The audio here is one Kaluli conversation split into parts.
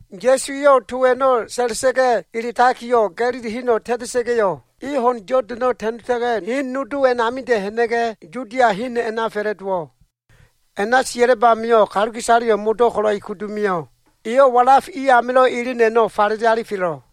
Ya꞉su eyo꞉ to a꞉no꞉ sa꞉la꞉sa꞉ga꞉ eletakiyo꞉, Ga꞉lili heno꞉ ta꞉ta꞉sa꞉ga꞉yo꞉, e ho꞉n Yodano꞉ ta꞉nota꞉ga꞉, hen nodo a꞉namida꞉ ha꞉na꞉ga꞉, Yudia hen a꞉na fa꞉la꞉dowo꞉. A꞉na sia꞉lab amio꞉ kaluka꞉isaleyo꞉ modo꞉ ko꞉lo꞉ e kudu mio꞉. Eyo꞉ walaf i amilo꞉ elen a꞉no꞉ falele alifelo꞉.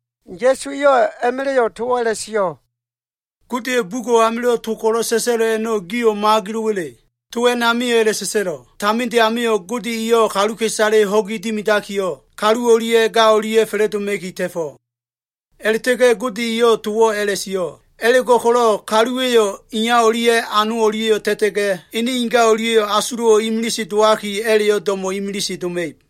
Ya꞉su eyo꞉ a꞉ma꞉la꞉yo꞉ towo꞉ a꞉la꞉sio꞉, “Godeya꞉ bugo꞉ amilo꞉ to ko꞉lo꞉ sa꞉sa꞉lo꞉ a꞉no꞉, gio꞉ mo꞉agelo꞉wa꞉le? To a꞉namio꞉ a꞉la꞉sa꞉sa꞉lo꞉, ‘Taminde amio꞉ Gode eyo꞉ kaluka꞉isale ho꞉gi dimidakiyo꞉, kalu o꞉lia꞉ ga o꞉lia꞉ fa꞉la꞉doma꞉ki ta꞉fo꞉.’ A꞉la꞉ta꞉ga꞉ Gode eyo꞉ towo꞉ a꞉la꞉sio꞉, ‘A꞉la꞉go꞉ko꞉lo꞉ kaluwa꞉yo꞉ iya o꞉lia꞉ ano o꞉lia꞉yo꞉ ta꞉ta꞉ga꞉, ene inga o꞉lia꞉ asulo꞉wo꞉ imilise dowaki, a꞉la꞉yo꞉ do꞉mo꞉ imilise doma꞉ib.’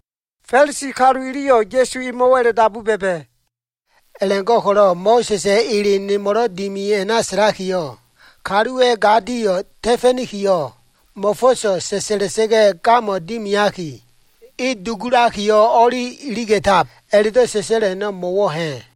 Fa꞉lisi kalu iliyo꞉ Ya꞉su emo꞉wo꞉ a꞉la꞉dabu ba꞉ba꞉, “A꞉la꞉go꞉ko꞉lo꞉ Mo꞉sa꞉sa꞉ ele nimo꞉lo꞉ dimi a꞉na sa꞉lakiyo꞉, ‘Kalu eyo꞉ ga dio꞉ ta꞉fa꞉nikiyo꞉, mo꞉fo꞉so꞉ sa꞉sa꞉la꞉sa꞉ga꞉ gamo꞉ dimiaki, e dugulakiyo꞉ o꞉li iliga꞉tab’ a꞉la꞉do꞉ sa꞉sa꞉lo꞉ a꞉no꞉ mo꞉wo꞉ ha꞉?”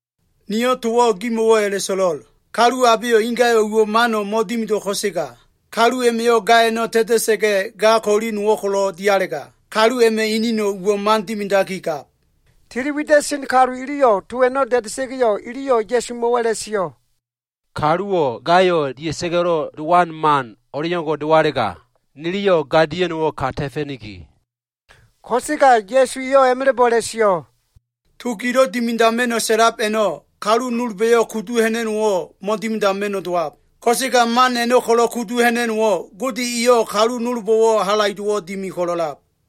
Niyo꞉ towo꞉ gimo꞉wo꞉ a꞉la꞉so꞉lo꞉l. Kalu abeyo꞉ ingayo꞉ uwo꞉ mano꞉ mo꞉dimido꞉ ko꞉sega, kalu a꞉ma꞉yo꞉ ga a꞉no꞉ ta꞉ta꞉sa꞉ga꞉, ga ko꞉li nowo꞉ ko꞉lo꞉ dialega, kalu a꞉ma꞉ eneno꞉ uwo꞉ man dimidakigab.” Tili wida꞉sen kalu iliyo꞉ to a꞉no꞉ da꞉da꞉sa꞉ga꞉yo꞉, iliyo꞉ Ya꞉sumo꞉wo꞉ a꞉la꞉sio꞉. “Kaluwo꞉ gayo꞉ dia꞉sa꞉ga꞉lo꞉ dowan man o꞉leo꞉ngo꞉ dowalega, niliyo꞉ ga dia꞉no꞉wo꞉ ka ta꞉fa꞉niki.” Ko꞉sega Ya꞉su eyo꞉ a꞉ma꞉la꞉bo꞉ a꞉la꞉sio꞉, “To gilo꞉ dimidama꞉no꞉ sa꞉lab a꞉no꞉, kalu nolba꞉yo꞉ kudu ha꞉na꞉no꞉wo꞉ mo꞉dimidama꞉no꞉ dowab. Ko꞉sega man a꞉no꞉ ko꞉lo꞉ kudu ha꞉na꞉no꞉wo꞉, Gode eyo꞉ kalu nolbo꞉wo꞉ halaido꞉wo꞉ dimi ko꞉lo꞉lab.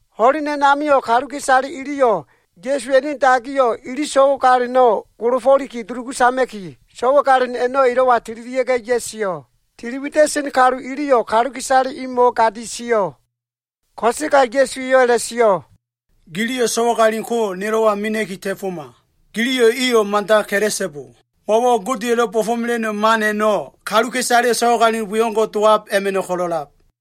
Ho꞉len a꞉namio꞉ kaluka꞉isale iliyo꞉ Ya꞉suwa꞉ ene dagiyo꞉ ili so꞉wagalino꞉ golofo꞉liki dulugu sama꞉ki, so꞉wagalin a꞉no꞉ elo꞉wa tililia꞉ga꞉ ya꞉sio꞉. Tili wida꞉sen kalu iliyo꞉ kaluka꞉isale imo꞉wo꞉ gadi sio꞉. Ko꞉sega Ya꞉su eyo꞉ a꞉la꞉sio꞉, “Giliyo꞉ so꞉wagalin ko, nelo꞉wa mena꞉ki ta꞉foma. Giliyo꞉ iyo꞉ mada ka꞉la꞉so꞉bo. Mo꞉wo꞉ Godeya꞉lo꞉ bo꞉fo꞉mela꞉no꞉ man a꞉no꞉, kaluka꞉isaleyo꞉ so꞉wagalin we o꞉ngo꞉ dowab a꞉ma꞉no꞉ ko꞉lo꞉lab.”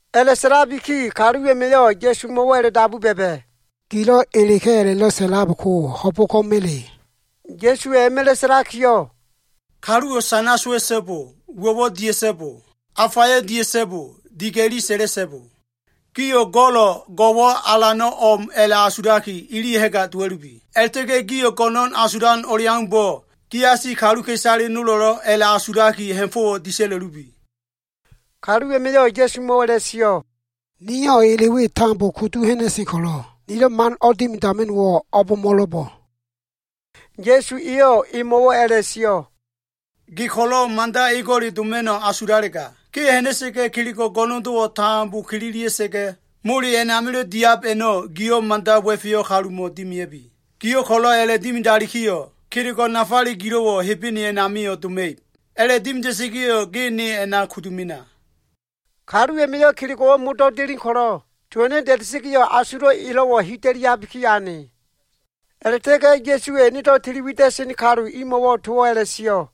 A꞉la꞉sa꞉labiki kalu a꞉ma꞉yo꞉ Ya꞉sumo꞉wo꞉ a꞉la꞉dabu ba꞉ba꞉, “Gilo꞉ eleka꞉ a꞉la꞉do꞉ sa꞉lab ko ho꞉bo꞉ko꞉ma꞉le?” Ya꞉suwa꞉ a꞉ma꞉la꞉ sa꞉lakiyo꞉, “Kaluwo꞉ sana sowa꞉so꞉bo. Uwo꞉wo꞉ dia꞉so꞉bo. Afayo꞉ dia꞉so꞉bo. Diga꞉li sa꞉la꞉so꞉bo. Gio꞉ go꞉lo꞉ go꞉wo꞉ alano꞉ o꞉m a꞉la꞉asulaki, ili ha꞉ga dowa꞉lubi. A꞉la꞉ta꞉ga꞉ gio꞉ go꞉no꞉n asulan o꞉leaumbo꞉, giasi kaluka꞉isale nolo꞉lo꞉ a꞉la꞉asulaki ha꞉fo꞉wo꞉ disa꞉la꞉lubi.” Kalu a꞉ma꞉yo꞉ Ya꞉sumo꞉wo꞉ a꞉la꞉sio꞉, “Niyo꞉ ele we tambo kudu ha꞉na꞉sen ko꞉lo꞉, nilo꞉ man o꞉dimidama꞉no꞉wo꞉ o꞉bo꞉mo꞉lo꞉bo꞉?” Ya꞉su eyo꞉ emo꞉wo꞉ a꞉la꞉sio꞉, “Ge ko꞉lo꞉ mada ego꞉le doma꞉no꞉ asulalega, ge ha꞉na꞉sa꞉ga꞉ kelego꞉ go꞉no꞉ndo꞉wo꞉ tambo kililia꞉sa꞉ga꞉, mole a꞉namilo꞉ diab a꞉no꞉, giyo꞉ mada wa꞉feyo꞉ kalumo꞉ dimea꞉bi. Giyo꞉ ko꞉lo꞉ a꞉la꞉dimidalikiyo꞉, kelego꞉ nafale gilo꞉wo꞉ Hebene a꞉namio꞉ doma꞉ib. A꞉la꞉dimida꞉sa꞉ga꞉yo꞉ ge ne a꞉na kudu mena.” Kalu a꞉ma꞉yo꞉ kelego꞉wo꞉ modo꞉ delen ko꞉lo꞉, to a꞉no꞉ da꞉da꞉sa꞉ga꞉yo꞉, asulo꞉ elo꞉wo꞉ hida꞉liabiki ane. A꞉la꞉ta꞉ga꞉ Ya꞉suwa꞉ enedo꞉ tili wida꞉sen kalu imo꞉wo꞉ towo꞉ a꞉la꞉sio꞉,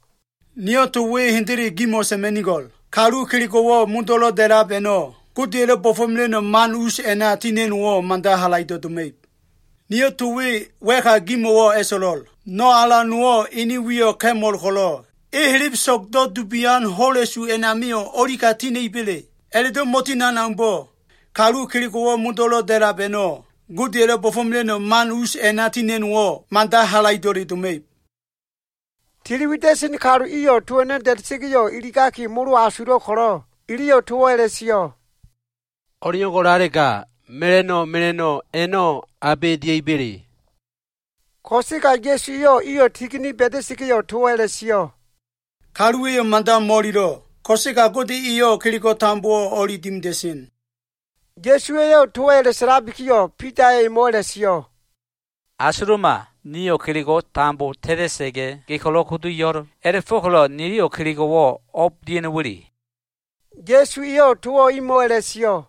“Niyo꞉ to we hendele gimo꞉ sa꞉ma꞉nigo꞉l. Kalu kelego꞉wo꞉ modo꞉lo꞉ da꞉lab a꞉no꞉, Godeya꞉lo꞉ bo꞉fo꞉mela꞉no꞉ man us a꞉na tina꞉no꞉wo꞉, mada halaido꞉ doma꞉ib. Niyo꞉ to we wa꞉ka gimo꞉wo꞉ a꞉so꞉lo꞉l. No꞉ alan nowo꞉ ene wiyo꞉ ka꞉mol ko꞉lo꞉, e helebeso꞉gdo꞉ dubian ho꞉la꞉su a꞉namio꞉ o꞉lika tina꞉iba꞉le? A꞉la꞉do꞉ mo꞉tinan aumbo꞉, kalu kelego꞉wo꞉ modo꞉lo꞉ da꞉lab a꞉no꞉ Godeya꞉lo꞉ bo꞉fo꞉mela꞉no꞉ man us a꞉na tina꞉no꞉wo꞉, mada halaido꞉le doma꞉ib.” Tili wida꞉sen kalu iyo꞉ to a꞉no꞉ da꞉da꞉sa꞉ga꞉ iligaki molo asulo꞉ ko꞉lo꞉, iliyo꞉ towo꞉ a꞉la꞉sio꞉, “O꞉leo꞉ngo꞉lalega, mela꞉no꞉ mela꞉no꞉ a꞉no꞉ abe dia꞉iba꞉le?” Ko꞉sega Ya꞉su eyo꞉ iyo꞉ tigini ba꞉da꞉sa꞉ga꞉yo꞉ towo꞉ a꞉la꞉sio꞉, “Kaluwa꞉yo꞉ mada mo꞉ililo꞉. Ko꞉sega Gode eyo꞉ kelego꞉ tambowo꞉ o꞉li dimida꞉sen.” Ya꞉su eyo꞉ towo꞉ a꞉la꞉sa꞉labikiyo꞉, Bida eyo꞉ emo꞉wo꞉ a꞉la꞉sio꞉, “Asuluma! Nio꞉ kelego꞉wo꞉ tambo ta꞉ta꞉sa꞉ga꞉, ge ko꞉lo꞉ kudu yo꞉l. A꞉la꞉fo꞉ko꞉lo꞉ niliyo꞉ kelego꞉wo꞉ o꞉b dia꞉no꞉wa꞉le?” Ya꞉su eyo꞉ towo꞉ imo꞉wo꞉ a꞉la꞉sio꞉,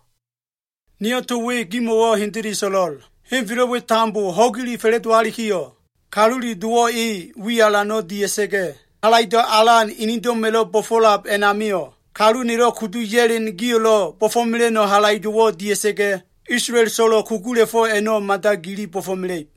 “Niyo꞉ to we gimo꞉wo꞉ hendele so꞉lo꞉l. Henfelo꞉ we tambo ho꞉gile fa꞉la꞉dowalikiyo꞉, Kalule Dowo꞉ e wi alano꞉ dia꞉sa꞉ga꞉, halaido꞉ alan enedo꞉ma꞉lo꞉ bo꞉fo꞉lab a꞉namio꞉, kalu nelo꞉ kudu ya꞉len gio꞉lo꞉ bo꞉fo꞉mela꞉no꞉ halaido꞉wo꞉ dia꞉sa꞉ga꞉, Isolael so꞉lo꞉ kugula꞉fo꞉ a꞉no꞉, mada gili bo꞉fo꞉mela꞉ib.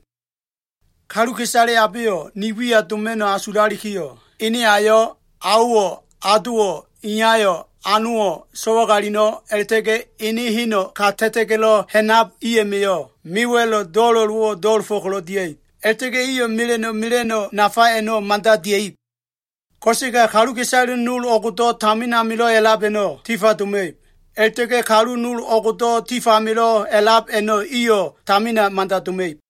Kaluka꞉isale abeyo꞉ ni wiya doma꞉no꞉ asulalikiyo꞉, ene ayo꞉, aowo꞉, adowo꞉, iyayo꞉, anowo꞉, so꞉wagalino꞉, a꞉la꞉ta꞉ga꞉ ene heno꞉ ka ta꞉ta꞉ga꞉lo꞉ ha꞉nab i a꞉ma꞉yo꞉, mewa꞉lo꞉ do꞉la꞉lowo꞉wo꞉ do꞉la꞉fo꞉ ko꞉lo꞉ dia꞉ib. A꞉la꞉ta꞉ga꞉ iyo꞉ mela꞉no꞉ mela꞉no꞉ nafa a꞉no꞉ mada dia꞉ib. Ko꞉sega kaluka꞉isale nol o꞉gdo꞉ tamin amilo꞉ a꞉lab a꞉no꞉, tifa doma꞉ib. A꞉la꞉ta꞉ga꞉ kalu nol o꞉gdo꞉ tifamilo꞉ a꞉lab a꞉no꞉, iyo꞉ tamina mada doma꞉ib.”